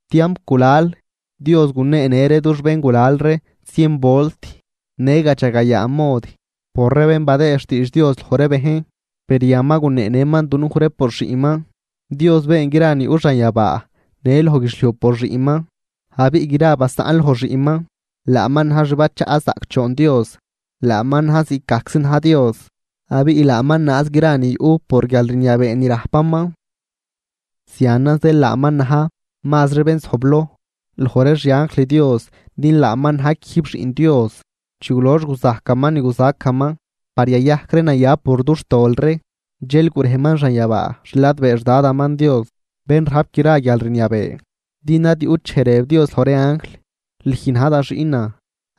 Tiamp gulal, Dios guneenë ree dux béngulal ree zien volt në gadxagayaa mod por ree bén badëë xtiidx Dios loj ree bejn, per yan ma guneenëman dunuj ree por Xiꞌnman. Dios been gra ni yuꞌ xanyabaa në loj guidxliuj por Xiꞌnman. Abiꞌ gra basaꞌn loj Xiꞌnman. Laaman na̱j xbachaꞌ zaꞌcdxoon Dios, laaman na̱j ziꞌcgajczi na̱j Dios. Abiꞌ laaman naaz gra ni yuꞌ por guialrniabee ni rajpaman. Zianan zeel laaman na̱j mazri bén zojbloj loj ree xianjl Dios din laaman na̱j quijb Xiꞌn Dios. Chi gulox guzajcaman ni guzacaman par yayajc ree naya por dux tol ree, dxel gurejman xanyabaa xladbee xDadaman Dios bén rajp gra guialrniabee Din ad yuꞌt dxej rëb Dios loj ree anjl: Lüj na̱j da xiꞌnan,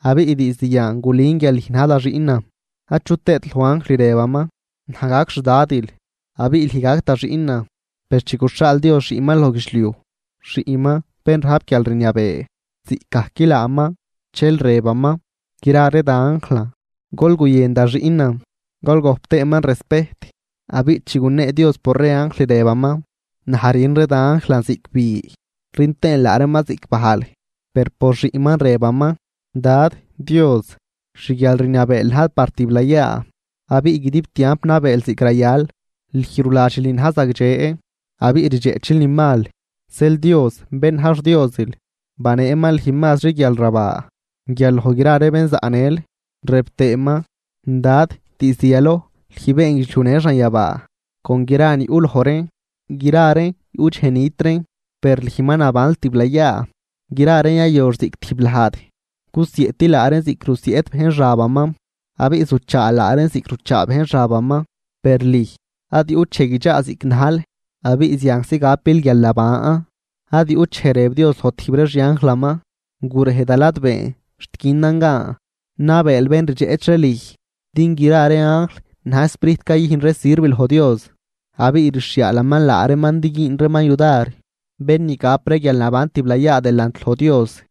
abiꞌ diizd yan gulün guial lüj na̱j da xiꞌnan. Achut tëët loj anjl rëbaman: Naj gac Xdadil, abiꞌ lüj gac da xiꞌnan. Per chi guxhaal Dios Xiꞌnman loj guidxliuj, Xiꞌnman bén rajp guialrniabee ziꞌcgajc laaman, dxel rëbaman: Gra ree da anjlan, gol guyën da Xiꞌnan, gol gojp tëëman respejt. Abiꞌ chi gunee Dios por ree anjl, rëbaman: Naj rün ree da anjlan ziꞌc bi, rün tëën laa reeman ziꞌc bajl. Per por Xiꞌnman rëbaman: Dad Dios, xguialrniabeel na̱j par tiblayaa, abiꞌ guidib tiamp nabeel ziꞌc rayal. Lüj ruladxil ni na̱j zagdxe abiꞌ rdxeꞌchil ni mal. Zeel Dios bén na̱j xDiosil baneeman lüj mazri guial rabaa guial loj gra ree bén zaꞌnël. Rëb tëëman: Dad, diizd yaloj lüj been guidxliuj në xanyabaa con gra ni yuꞌ loj reen. Gra reen yuꞌ dxej nit reen, per lüj ma nabanl tiblayaa. Gra reen yayox ziꞌc tijb lajd, gusieꞌtil laa reen ziꞌc rusieꞌt bejn xabaman, abiꞌ zuchaal laa reen ziꞌc ruchaa bejn xabaman, per lüj ad yuꞌt dxej guidxaa ziꞌc najl abiꞌ zianczi gapil guialnaban. Ad yuꞌt dxej rëb Dios loj tijb ree xianjlaman: Gurej da ladbeen xt günan gan nabeel bén rdxeꞌch ree lüj. Din gra ree anjl na̱j sprijt cayüjn ree sirv loj Dios, abiꞌ rxhiaalaman laa reeman din güün reeman yudar bén ni gap ree guialnaban tiblayaa delant loj Dios.